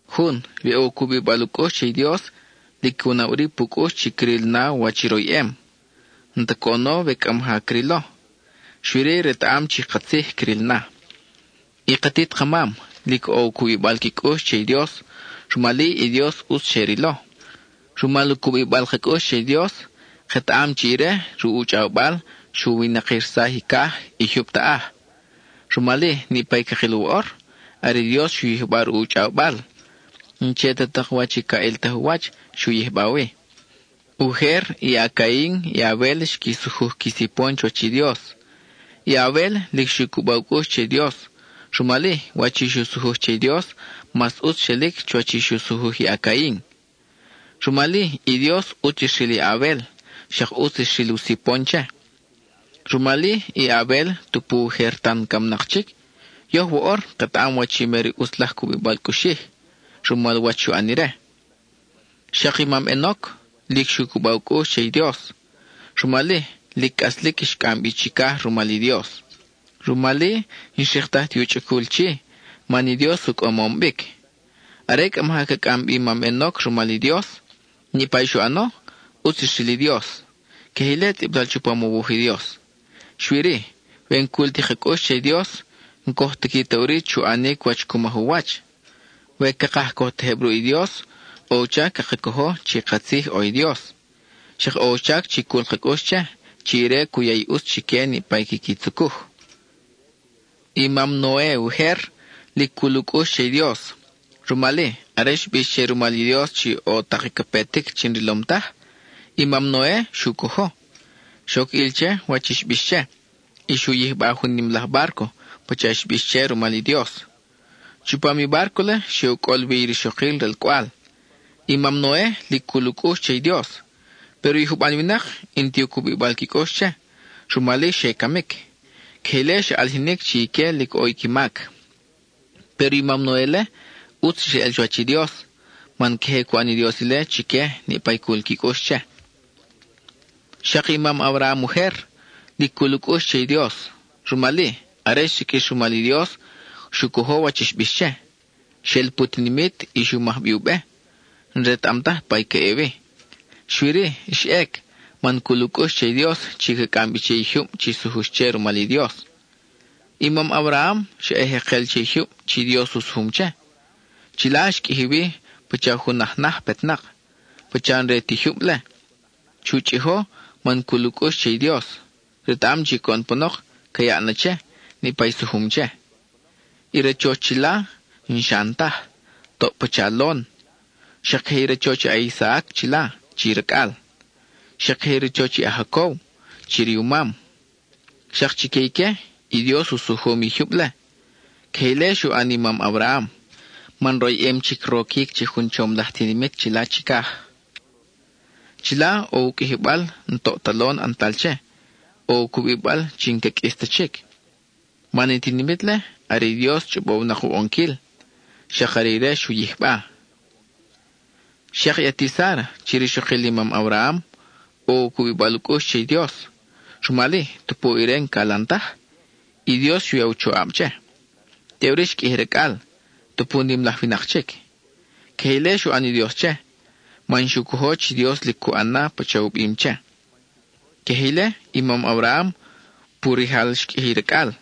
Jun, we ʼo u cubibal u cʼux che i Dios, lic cu na ʼuri pu cʼux chi cril na wach i royʼem. N-ta coʼono we cʼa maja crilo, xui-ri retaʼam chi katzij cril na. I katit ka mam, lic ʼo i u cubibal qui cʼux che i Dios, rumal-i i Dios ʼutz xe rilo. Rumal u cubibal ka cʼux che i Dios, ketaʼam chi ire, ruʼ u chʼawbal, xu winakirsaj i caj, i jyub taʼaj. Rumal-i, niʼpa i cakil woʼor, are i Dios xu yijba ruʼ u chʼawbal, n-che ta tak wach ca ʼiltaj u wach xu yijba wi. Ujer i a-Cain, i a-Abel xqui sujuj qui sipon chuwach i Dios. I a-Abel, lic xu cuba u cʼux che i Dios, rumal-i, wach i xu sujuj che i Dios mas ʼutz xelic chuwach i xu sujuj i a-Cain. Rumal-i, i Dios ʼutz xril i a-Abel, xak ʼutz xril i u sipon che. Rumal-i, i a-Abel tupu ujer tan camnak chic, yoj woʼor ketaʼam wach i mer ʼutz laj cubibal cʼuxij, rumal wach xu ʼan ire. Xak i mam Enoc, lic xu cuba u cʼux che i Dios. Rumal-i, lic cʼaslic, xcʼam bi chicaj rumal i Dios. Rumal-i, n-xriktaj ti u chʼacul chi, man i Dios u cʼamom bic. Are cʼa maja ca cʼam bi i mam Enoc rumal i Dios, niʼpa i xu ʼano, ʼutz xril i Dios. Queje ile tzʼibtal chupam u wuj i Dios. Xui-ri, we n-cul ti ka cʼux che i Dios, n-coj tiqui ta ʼuri chu ʼanic wach cu maj u wach. We cakaj coj tejeb ruʼ i Dios, ʼo u chac caka cojo chi katzij ʼo i Dios; xak ʼo u chac chi cul ka cʼux che, chi ire cu ya i ʼutz chique niʼpa i quiqui tzucuj. I mam Noe ujer, lic cul u cʼux che i Dios. Rumal-i, are xbix che rumal i Dios chi ʼo tak i ca petic chi n-rilom taj, i mam Noe xu cojo. Xoc ʼil che wach i xbix che, y xu yijba jun nim laj bárco pacha xbix che rumal i Dios. Chupam i bárco-le xe u cʼol wi i rixokil ralcʼwal. I mam Noe, lic cul u cʼux che i Dios, péro i juban winak n-ti u cubibal qui cʼux che, rumal-i, xe camic; queje ile xa ʼalijinic chi ique lic ʼo qui mac. Péro i mam Noe-le, ʼutz xeʼel chuwach i Dios, man queje cu ʼan i Dios ile chique niʼpa i cul qui cʼux che. Xak i mam Abraham ujer, lic cul u cʼux che i Dios. Rumal-i, are xsiqʼuix rumal i Dios, xu cojo wach i xbix che. Xel pu tinimit y xu maj bi u be, n-retaʼam taj pa i ca ʼe wi. Xui-ri, xa ʼec man cul u cʼux che i Dios chi ca cʼam bi che i jyub chi xsujux che rumal i Dios. I mam Abraham xa ʼe jekel che i jyub chi Dios u sujum che; chila xqʼuiji wi pacha jun aj naj petnak, pacha n-re ti jyub-le. Xu chʼijo man cul u cʼux che i Dios; retaʼam chi coʼon panok ca yaʼ na che, niʼpa i sujum che. I rachoch chila, n-xan taj, toʼ pacha lon. Xak queje i rachoch a-Isaac chila, chi racʼal; xak queje i rachoch i a-Jacob chi riumam. Xak chique ique, i Dios u sujum i jyub-le. Queje ile xu ʼan i mam Abraham, man royʼem chic roquic che jun chom laj tinimit chila chicaj. Chila, ʼo u qʼuijibal n-toʼ ta lon ʼantal che, ʼo u cubibal chi n-ca qʼuis ta chic; man i tinimit-le are i Dios chʼobow-nak u ʼonquil; xak are ire xu yijba. Xak i ati Sára (chi rixokil i mam Abraham) ʼo i u cubibal u cʼux che i Dios, rumal-i, tupu ire n-calan taj, i Dios xu ya u choʼab che. Teʼuri xqʼuiji racʼal, tupu nim laj winak chic. Queje ile xu ʼan i Dios che, man xu cojo chi i Dios lic cu ʼan na pacha u bim che. Queje ile, i mam Abraham, pu rijal xqʼuiji i racʼal.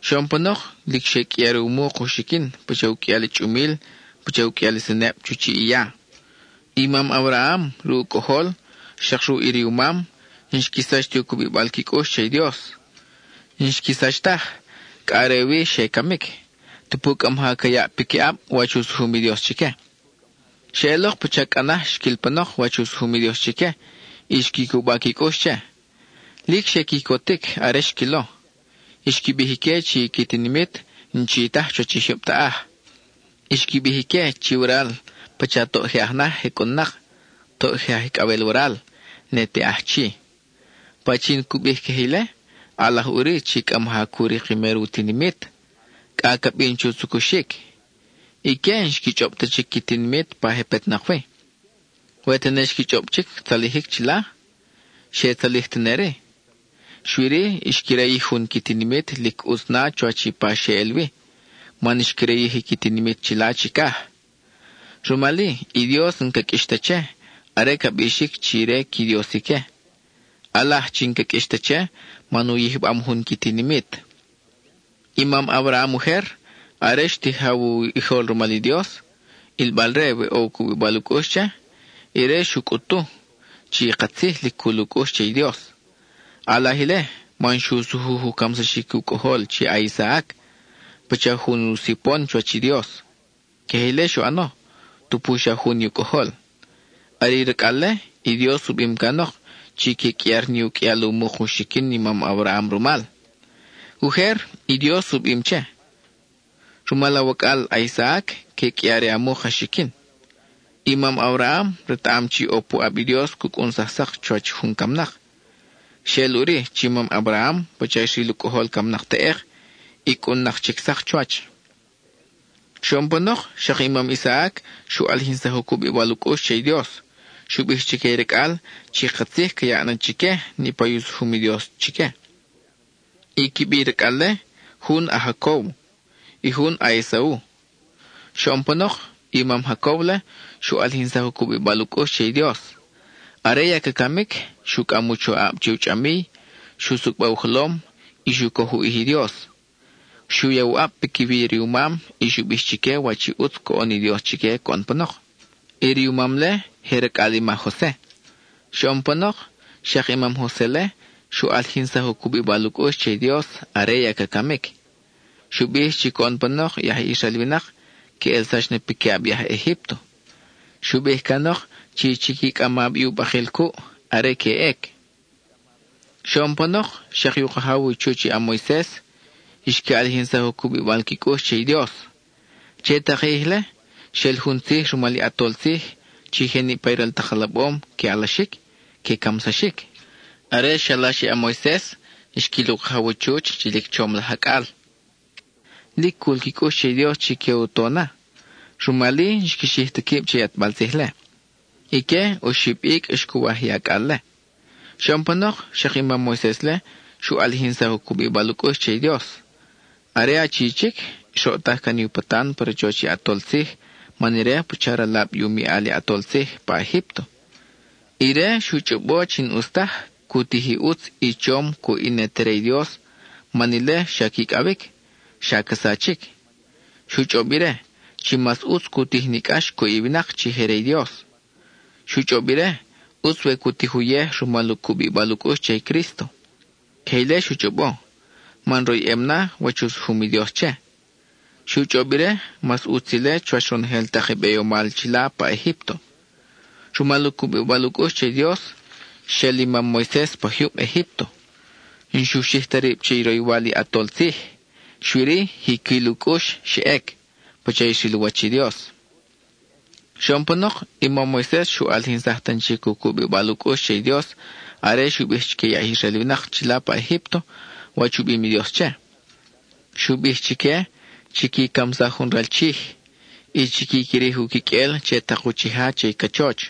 Xoʼon panok lic xe qʼuiar u muk u xiquin pacha u qʼuial i chʼumil, pacha u qʼuial i seneb chu chiʼ i ya. I mam Abraham, ruʼ u cʼojol, xak ruʼ i riumam, n-xqui sach ti u cubibal qui cʼux che i Dios. N-xqui sach taj, cʼa are wi xe camic, tupu cʼa maja ca yaʼ piquiʼab wach u sujum i Dios chique. Xeʼelok pacha cʼa naj xquil panok wach u sujum i Dios chique, y xqui cuba qui cʼux che. Lic xe quicotic are xquilo. Xqui bij ique chi i qui tinimit n-chi taj chuwach i jyub taʼaj. Xqui bij ique chi waral pacha toʼ je aj naj je cʼun-nak, toʼ je aj icʼawel waral, ne te aj chi. Pachin cu bij queje ile, ʼalaj ʼuri chi cʼa maja cu rik i mer u tinimit, cʼa ca bin chu tzucuxic. Ique n-xqui chʼob ta chic qui tinimit pa je petnak wi. We tene xqui chʼob chic tzalijic chila, xe tzalij tene-ri. Xui-ri, xqui rayij jun qui tinimit lic ʼutz na chuwach i pa xe ʼel wi, man xqui rayij i qui tinimit chila chicaj. Rumal-i, i Dios n-ca qʼuix ta che, are ca bixic chi ire qui Dios ique. ʼAlaj chi n-ca qʼuix ta che man u yijbam jun qui tinimit. I mam Abraham ujer, are xtijaw u ʼijol rumal i Dios, ʼilbal-re we ʼo u cubibal u cʼux che, ire xu cʼutu chi katzij lic cul u cʼux che i Dios. ʼAlaj ile, man xu sujuj u camsaxic u cʼojol chi a-Isaac, pacha jun u sipon chuwach i Dios. Queje ile xu ʼano, tupu xa jun i u cʼojol. Are i racʼal-le, i Dios u bim canok chi que qʼuiar ni u qʼuial u muk u xiquin i mam Abraham rumal. Ujer, i Dios u bim che: “Rumal awacʼal a-Isaac, que qʼuiar i a muk a xiquin.” I mam Abraham retaʼam chi ʼo puʼab i Dios cu cʼunsaj sak chuwach jun camnak. Xeʼel ʼuri chi i mam Abraham pacha xril u cʼojol camnak teʼek, y cʼun-nak chic sak chuwach. Xoʼon panok, xak i mam Isaac xu ʼalijinsaj u cubibal u cʼux che i Dios: xu bij chique i racʼal chi katzij ca yaʼ na chique niʼpa i u sujum i Dios chique. I qui bi i racʼal-le: jun, a-Jacob; i jun a-Esau. Xoʼon panok, i mam Jacob-le xu ʼalijinsaj u cubibal u cʼux che i Dios. Are ya ca camic, xu cʼam u choʼab che u chʼamiy, xu xucba u jolom, y xu coj u ʼij i Dios. Xu ya u ʼab piquiwi i riumam y xu bij chique wach i ʼutz coʼon i Dios chique coʼon panok. I riumam-le, je racʼal i ma Jose. Xoʼon panok, xak i mam Jose-le xu ʼalijinsaj u cubibal u cʼux che i Dios are ya ca camic. Xu bij chi coʼon panok i aj Israel winak que ʼelsax na piquiʼab i aj Egípto. Xu bij canok chi chiqui cʼama bi u bakil cuʼ, are que ʼec. Xoʼon panok, xak i u kajaw u chuch i a-Moises xqui ʼalijinsaj u cubibal qui cʼux che i Dios. Che tak i ʼij-le, xel jun tzij rumal i ʼatol tzij, chi je niʼpa i ral tak alabom que alaxic, que camsaxic. Are xalax i a-Moises, xquil u kajaw u chuch chi lic chom laj acʼal. Lic cul qui cʼux che i Dios chi que u to na; rumal-i, n-xqui xij ta quib che i ʼatbal tzij-le. Ique, oxib icʼ xcuwaj i acʼal-le. Xoʼon panok, xak i mam Moises-le xu ʼalijinsaj u cubibal u cʼux che i Dios. Are achi chic, xroʼtaj can i u patan pa rachoch i ʼatol tzij man ire pacha ralab i u miʼal i ʼatol tzij pa Egípto. Ire xu chʼobo chi n-ʼus taj cu tij i ʼutz i chom cuʼ i ne te re i Dios man ile xa quicʼawic, xa ca sachic. Xu chʼob ire, chi mas ʼutz cu tij ni cʼax cuʼ i winak chi je re i Dios. Xu chʼob ire, ʼutz we cu tij uyej rumal u cubibal u cʼux che i Crísto. Queje ile xu chʼobo man royʼem na wach u sujum i Dios che. Xu chʼob ire, mas ʼutz ile chuwach ronojel tak i beyomal chila pa Egípto. Rumal u cubibal u cʼux che i Dios, xel i mam Moises pa jyub Egípto. N-xu xij ta rib che i roywal i ʼatol tzij, xui-ri, jiquil u cʼux xa ʼec, pacha xril u wach i Dios. Xoʼon panok, i mam Moises xu ʼalijinsaj tan chic u cubibal u cʼux che i Dios are xu bij chique i aj Israel winak chila pa Egípto wach u bim i Dios che. Xu bij chique, chiqui camsaj jun ral chij, y chiqui quirij u quiqʼuel che tak uchija che i cachoch.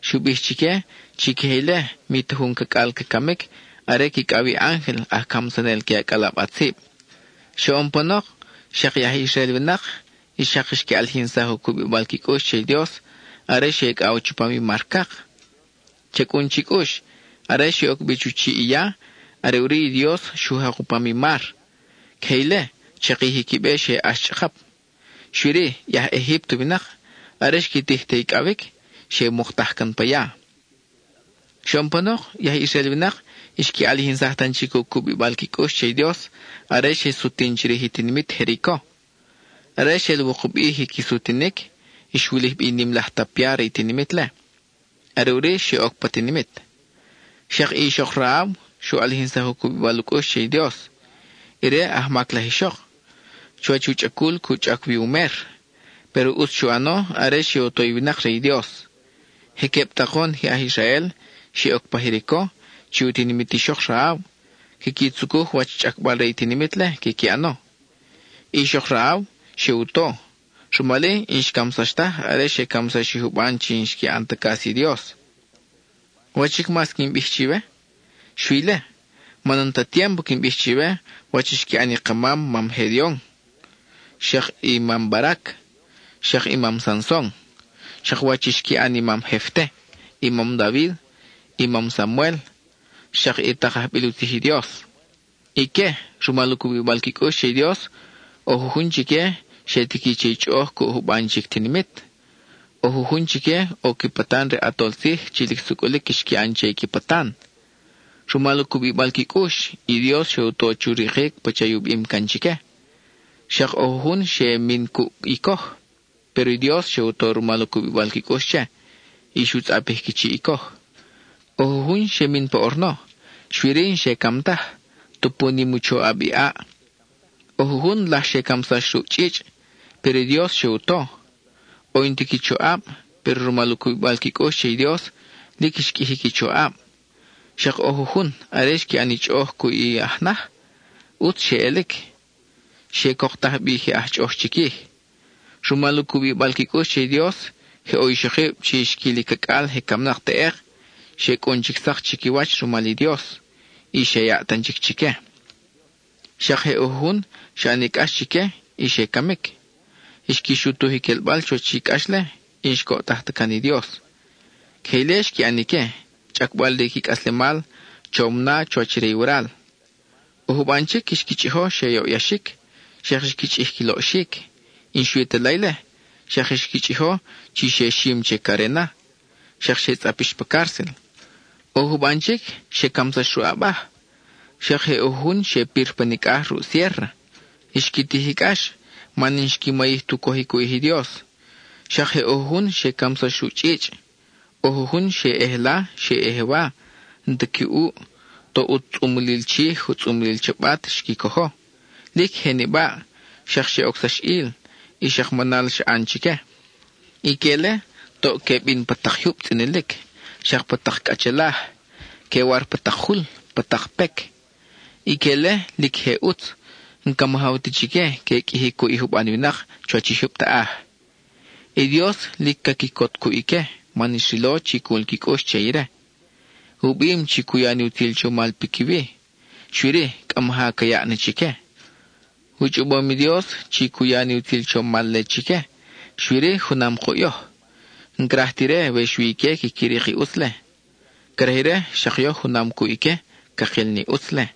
Xu bij chique, chi queje ile mi ta jun cacʼal ca camic are quicʼaw i ángel aj camsanel que acʼalab ʼatzib. Xoʼon panok, xak i aj Israel winak xak xqui ʼalijinsaj u cubibal qui cʼux che i Dios are xe icʼaw chupam i Mar Cak. Cha cʼun chi cʼux, are xe oc bi chu chiʼ i ya, are ʼuri i Dios xu jak u pam i mar; queje ile, chakij i qui be xe ʼax chʼakap. Xui-ri, i aj Egípto winak, are xqui tij te icʼawic, xe muktaj can pa ya. Xoʼon panok, i aj Israel winak xqui ʼalijinsaj tan chic u cubibal qui cʼux che i Dios are xe sutin chirij i tinimit Jerico. Are xel wukub ʼij i qui sutinic, xwulij bi i nim laj tapia re i tinimit-le, are ʼuri xe oc pa tinimit. Xak i ixok Rahab xu ʼalijinsaj u cubibal u cʼux che i Dios. Ire ajmac laj ixok, chuwach u chʼacul cu chʼac wi u mer, péro ʼutz xu ʼano are xe u to i winak re i Dios. Je queb takon je aj Israel, xe oc pa Jerico (chi u tinimit ixok Rahab), quiqui tzucuj wach chʼacbal re i tinimit-le quiqui ʼano. Ixok Rahab xe u to; rumal-i, n-xcamsax taj are xe camsax i juban chi n-xqui ʼan ta cas i Dios. ¿Wach chic mas quin bij chiwe? Xui ile. Man n-ta tiémpo quin bij chiwe wach i xqui ʼan i ka mam ma Gedeon, xak i mam Barac, xak i mam Sanson; xak wach i xqui ʼan i mam Jefte, i mam David, i mam Samuel, xak i tak ajbil u tzij i Dios. Ique, rumal u cubibal qui cʼux che i Dios, ʼo jujun chique xe tiqui che i chʼoʼoj cuʼ juban chic tinimit. ʼO jujun chique ʼo qui patan re ʼatol tzij chi lic sucʼulic xqui ʼan che i qui patan. Rumal u cubibal qui cʼux, i Dios xe u to chu rikic pacha i u bim can chique. Xak ʼo jujun xe ʼe min cuʼ i coj, péro i Dios xe u to rumal u cubibal qui cʼux che, y xu tzʼapij qui chiʼ i coj. ʼO jujun xe min pa ʼorno, xui-ri n-xe cam taj tupu nim i u choʼab i ʼaʼ; ʼo jujun laj xe camsax ruʼ chʼichʼ, péro i Dios xe u to. ʼO i n-ta qui choʼab, péro rumal u cubibal qui cʼux che i Dios, lic xqʼuiji qui choʼab. Xak ʼo jujun, are xqui ʼan i chʼoʼoj cuʼ i aj naj, ʼutz xe ʼelic; xe coktaj bi je aj chʼoʼoj chiquij. Rumal u cubibal qui cʼux che i Dios, je ʼo ixokib chi xquil i cacʼal je camnak teʼek, xe cʼun chic sak chiquiwach rumal i Dios, y xe yaʼ tan chic chique. Xak je ʼo jujun xa ʼani cʼax chique y xe camic; xqui xutuj i quelbal chuwach i cʼax-le, y n-xcoʼtaj ta can i Dios. Queje ile xqui ʼan ique, chʼacbal re qui cʼaslemal chom na chuwach re i waral. ʼO juban chic xqui chʼijo xe yoʼyaxic, xak xqui chʼij qui loʼxic; y n-xui ta la ile, xak xqui chʼijo chi xe xim che carena, xak xe tzʼapix pa cárcel. ʼO juban chic xe camsax ruʼ abaj, xak je ʼo jujun xe pir pa nicʼaj ruʼ siérra. Xqui tij i cʼax man n-xqui mayij tu cojic u ʼij i Dios; xak je ʼo jujun xe camsax ruʼ chʼichʼ. ʼO jujun xe ʼe jela, xe ʼe jewa, n-ta qui ʼuʼ, toʼ u tzʼumlil chij, u tzʼumlil chabat xqui cojo; lic je nibaʼ, xak xe ocsax ʼil, y xak manal xa ʼan chique. Ique-le toʼ que bin pa tak jyub tzʼinilic, xak pa tak cʼachelaj; que war pa tak jul, pa tak pec. Ique-le lic je ʼutz; n-ca majaw ta chique que qʼuiji cuʼ i juban winak chuwach i jyub taʼaj. I Dios lic ca quicot cuʼ ique man xrilo chi cul qui cʼux che ire. U bim chi cu ya ni utzil chomal piquiwi; xui-ri, cʼa maja ca yaʼ na chique. U chʼobom i Dios chi cu ya ni utzil chomal-le chique, xui-ri junam kuʼ yoj. N-craj ta ire we xui ique quiqui rik i ʼutz-le. Craj ire xak yoj junam cuʼ ique cakil ni ʼutz-le.